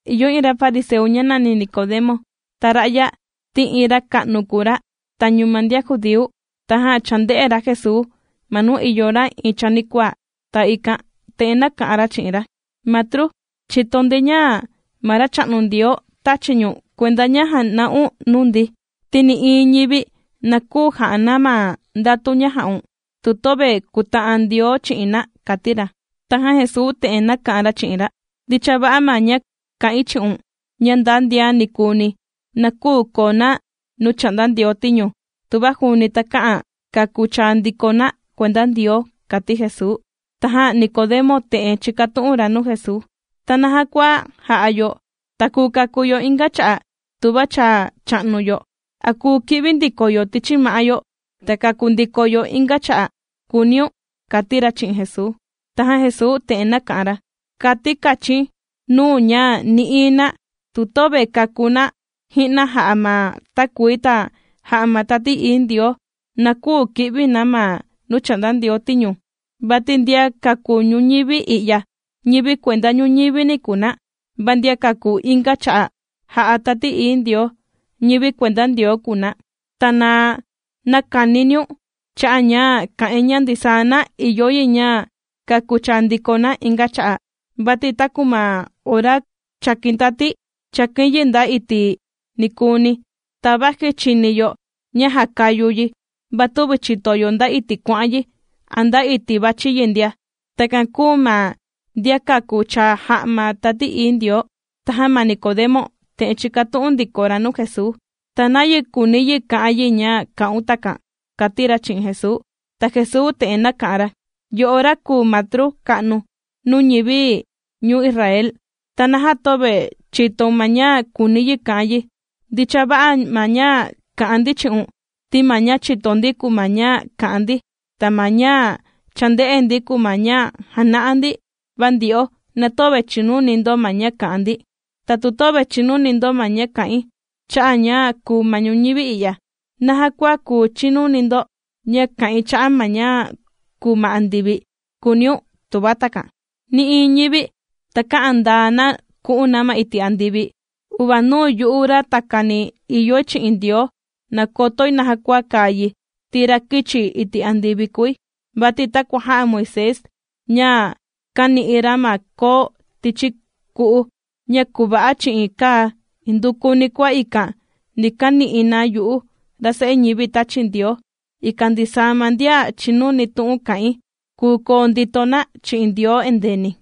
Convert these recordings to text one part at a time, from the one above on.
Ìyo iin ra fariseu, ña nàni Nicodemo. Ta ra'ya ti iin ra ka'nu kùu ra tañu ma ndian judíu. Tajan chānde'e ra Jesuu, ma nuu ìyo ra iin chanikuaa. Ta ikan te'en kà'an ra chi'in ra: ―Matru, chìto ndi ña ma Racha'nu Ndioo tāchi ñu̱n kuenda ña jàna'un nuu ndi, ti nï'iin ñivi na küu jà'a na ma ndatu ña jà'un, tu töve kùta'an Ndioo chi'in na ―kati ra. Tajan Jesuu te'en nāka'an ra chi'in ra: ―Ndicha va'a ma ña kà'in chi'un, ña nda ndian nikuuni na küu koo na nuu chà'nda Ndioo tiñu, tuva juuni takä'an kàku chaa ndiko na kuenda Ndioo ―kàti Jesuu. Tajan Nicodemo te'en chīkatu'un ra nuu Jesuu: ―¿Ta naja kua jà'a yo, ta kùu kàku yo inga cha'a' tuva cha cha'nu yo? ¿A kùu ki'vi ndiko yo tichi ma'á yo ta kàku ndiko yo inga cha'a'?, kùuniun ―kàti ra chi'in Jesuu. Tajan Jesuu te'en nāka'an ra: ―Kàti̱ kachi̱n nuu̱n ña nï'iin na, tu töve kàku ji'na na jà'a ma takuii ta jà'a ma Tati Ií Ndioo ndia, na küu ki'vi na ma nuu chà'nda Ndioo tiñu. Vati ndian kàku ñuñivi i'ya, ñivi kuenda ñuñivini kùu na, va ndian kàku inga cha'a', jà'a Tati Ií Ndioo, ñivi kuenda Ndioo kùu na. Ta na näkaniniun cha'a' ña kà'in ña ndisaa na ìyo yi ña kàku chaa ndiko na inga cha'a'. Vati taku ma ora chàkin tati, chàkin yi nda iti' nikuuni, ta vaji chìni yo ña jàkayu yi, va tüvi chìto yo nda iti' kuà'an yi, a nda iti' vàchi yi ndia, takan kùu ma ndian kàku chaa jà'a ma Tati Ií Ndioo. Tajan ma Nicodemo te'en chīkatu'un ndiko ra nuu Jesuu: ―¿Ta nayi kùuni yi ka'an yi ña kà'un takan? ―kàti ra chi'in Jesuu. Ta Jesuu te'en nāka'an ra: ―Yo'o ra kùu matru ka'nu nuu ñivi ñuu Israel, ¿ta naja töve chìtoun ma ña kùuni yi ka'an yi? Ndicha va'a ma ña kà'an ndi chi'un, ti ma ña chìto ndi kùu ma ña kà'an ndi, ta ma ña cha ndē'e ndi, kùu ma ña jàna'a ndi, va ndyo'o na töve chìnuni ndo ma ña kà'an ndi. Ta tu töve chìnuni ndo ma ña kà'in cha'a' ña kùu ma ñuñivi i'ya, ¿naja kua kuu chinuni ndo ña kà'in cha'a' ma ña kùu ma andivi?, kùuniun, tuva takan. ’Nï'iin ñivi takä'an ndaa na ku'un na ma iti' andivi, uvanuu yu'u ra takani ìyoi chi'in Ndioo nàkotoi naja kàa yi, ti ra kīchi iti' andivi kùi. Vati takua jā'a Moisés ña kāni'i ra ma koo tichi ku'u ña kùva'a chi'in kaa, indukuni kua ikan ni kani'i na yu'u, ra Se'e ñivi tāchi Ndioo, ikan ndisaa ma ndian chìnuni tu'un kà'in, kùu koo ndito na chi'in Ndioo endeeni.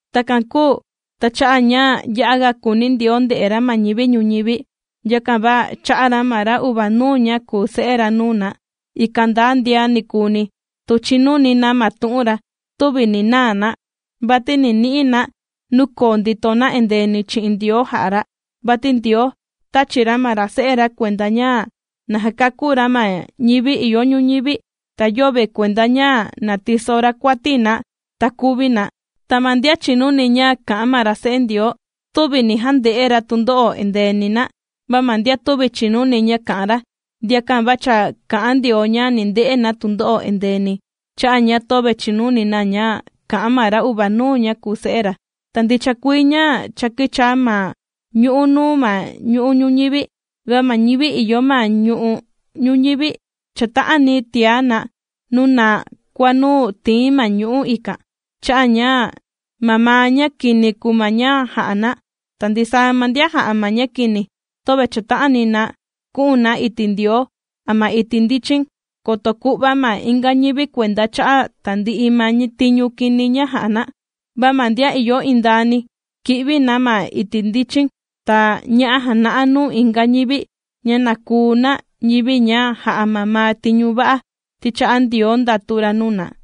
’Takan kūu ta cha'a' ña ya'a ga kùuni Ndioo nde'e ra ma ñivi ñuñivi, yakan va chā'a ra ma ra uvanuu ña kùu Se'e ra nuu na, ikan nda ndian nikuuni tu chinuni na ma tu'un ra, tüvi ni naa na, vati ni ni'i na nuu koo ndito na endeeni chi'in Ndioo jà'a ra. Vati Ndioo tāchi ra ma ra Se'e ra kuenda ña na jakakú ra ma ñivi ìyo ñuñivi, ta yöve kuenda ña na tiso ra kuati na ta kuvi na. ’Ta ma ndian chìnuni ña kà'an ma ra Se'e Ndioo, tüvi ni jande'e ra tundo'o endeeni na. Va ma ndian tüvi chìnuni ña kà'an ra, ndiakan va cha kà'an Ndioo ña ni nde'e na tundo'o endeeni cha'a' ña töve chìnuni na ña kà'an ma ra uvanuu ña kùu Se'e ra. Ta ndicha kuii ña cha kīchaa ma ñu'ú nuu ma ñu'u' ñuñivi, va ma ñivi ìyo ma ñu'u' ñuñivi chàta'ani tiá na nuu naa kua nuu tìin ma ñu'ú ikan, cha'a' ña mamaa ña kini kùu ma ña jà'a na. Ta ndisaa ma ndian jà'a ma ña kini, töve chàta'ani na ku'un na iti' Ndioo a ma iti' ndichin, koto ku'va ma inga ñivi kuenda cha'a' tandi'i ma tiñu kini ña jà'a na. Va ma ndian ìyo indaani, kì'vi na ma iti' ndichin, ta ña'a jàna'a nuu inga ñivi ña na kuu na ñivi ña jà'a mamaa tiñu va'a ti chà'a Ndioo ndatu ra nuu na.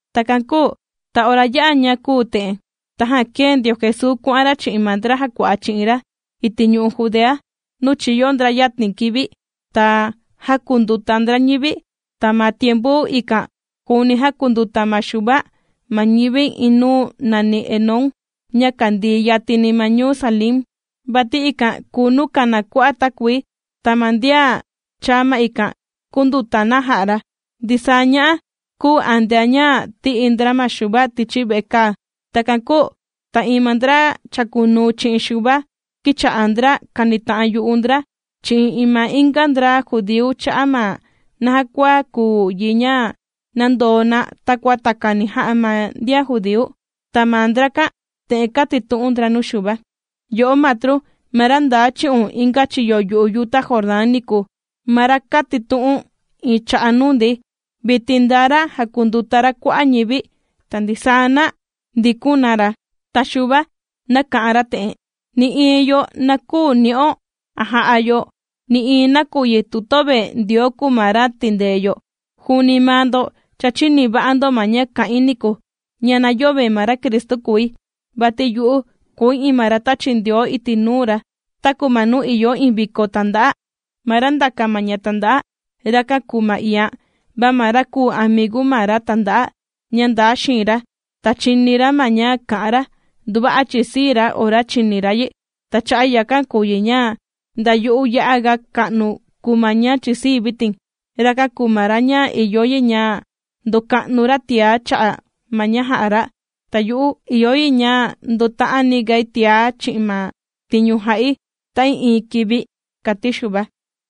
Takan kūu ta ora yā'a ña kūu te'en, tajan kēe ndio Jesuu kuà'an ra chi'in ma ndra jàkua'a chi'in ra iti' ñu'u' Judea, nuu chīyo ndra yatin kivi ta jākunduta ndra ñivi. Ta ma tiempu ikan juuni jākunduta ma Xuva ma ñivi iin nuu nàni Enón, ña kàndii yatini ma ñuu Salim, vati ikan kùu nuu kàna kua'a' takuii, ta ma ndian chàa ma ikan, kūnduta na jà'a ra. Ndisaa ña'a kūu antea ña tī'i ndra ma Xuva tichi vekaa. Takan kūu ta iin ma ndra chàkunuu chi'in Xuva kīcha'a ndra kànita'an yu'u ndra chi'in iin ma inga ndra judíu cha'a' ma naja kua kùu yi ña nàndoo na takua takani jà'a ma ndian judíu. Ta ma ndrakan te'en kātitu'un ndra nuu Xuva: ―Yo'o Matru, ma ra ndaa chi'un inga chiyo yu'u yuta Jordán niku, ma ra kātitu'u̱n iin cha'a' nuu ndi, vitin ndaa ra jàkunduta ra kua'a' ñivi, ta ndisaa na ndikun na ra. Ta Xuva nāka'an ra te'en: ―Nï'iin yo na küu ni'o a jà'a yo nï'iin nakuyi tu yöve Ndioo kùu ma ra tindee yo. Juuni maa ndo cha chīni va'a ndo ma ña kā'in niku, ña na yöve ma ra Cristu kùi, vati yu'u kùu iin ma ra tāchi Ndioo iti' nuu ra. Taku ma nuu ìyo iin viko tànda'a, ma ra ndàka ma ña tànda'a, rakan kùu ma iian, va ma ra kùu amigu ma ra tànda'a ña ndaa xiin ra ta chìni ra ma ña kà'an ra, nduva'a chìsii ra ora chìni ra yi. Ta cha'a' yakan kùu yi ña nda yu'u ya'aga ka'nu kùu ma ña chìsii̱ vitin. Rakan kùu ra ña ìyo yi ña ndoka'nu ra tiá cha'a' ma ña jà'a ra, ta yu'u ìyo yi ña ndota'ani gai tiá chi'in ma tiñu jà'i ta'ii'iin kivi ―kàti Xuva.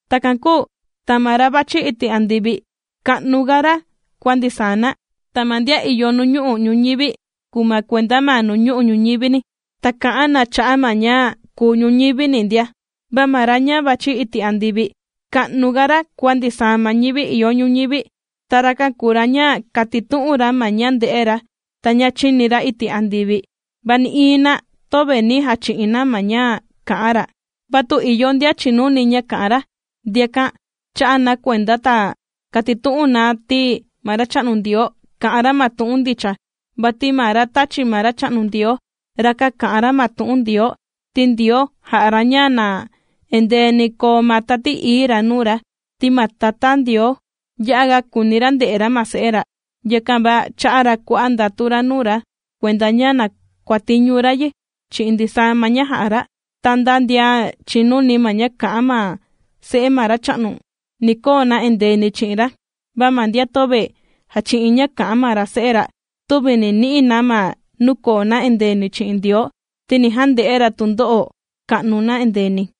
Takan kūu ta ma ra vàchi iti' andivi, ka'nuga ra kua ndisaa na. Ta ma ndian ìyo nuñu'u' ñuñivi kùu na kuenda ma nuñu'u' ñuñivini, ta kà'an na cha'a' ma ña kùu ñuñivini ndia. Va ma ra ña vàchi iti' andivi, ka'nuga ra kua ndisaa ma ñivi ìyo ñuñivi. Ta rakan kùu ra ña kàtitu'un ra ma ña ndē'e ra ta ña chīni ra iti' andivi, va nï'iin na töve nī jachi'in na ma ña kà'an ra. Va tu ìyo ndian chìnuni ña kà'an ra, ndiakan chà'a na kuenda ta kàtitu'un na ti ma Racha'nu Ndioo kà'an ra ma tu'un ndicha. Vati ma ra tāchi ma Racha'nu Ndioo, rakan kà'an ra ma tu'un Ndioo, ti Ndioo jà'a ra ña na endeeni ni koo ma Tati Ií ra nuu ra. Ti ma Tatá Ndioo ya'a ga kùuni ra nde'e ra ma ra Se'e ra, yakan va chā'a ra kua'a' ndatu ra nuu ra kuenda ña na kuàtiñu ra yi chi'in ndisaa ma ña jà'a ra. Ta nda ndian chìnuni ma ña kà'an ma Se'e ma Racha'nu, ni koo na endeeni chi'in ra, va ma ndian töve jàchi'in ña kà'an ma ra Se'e ra, tüvi ni ni'i na ma nuu koo na endeeni chi'in Ndioo, ti ni jande'e ra tundo'o ka'nu na endeeni.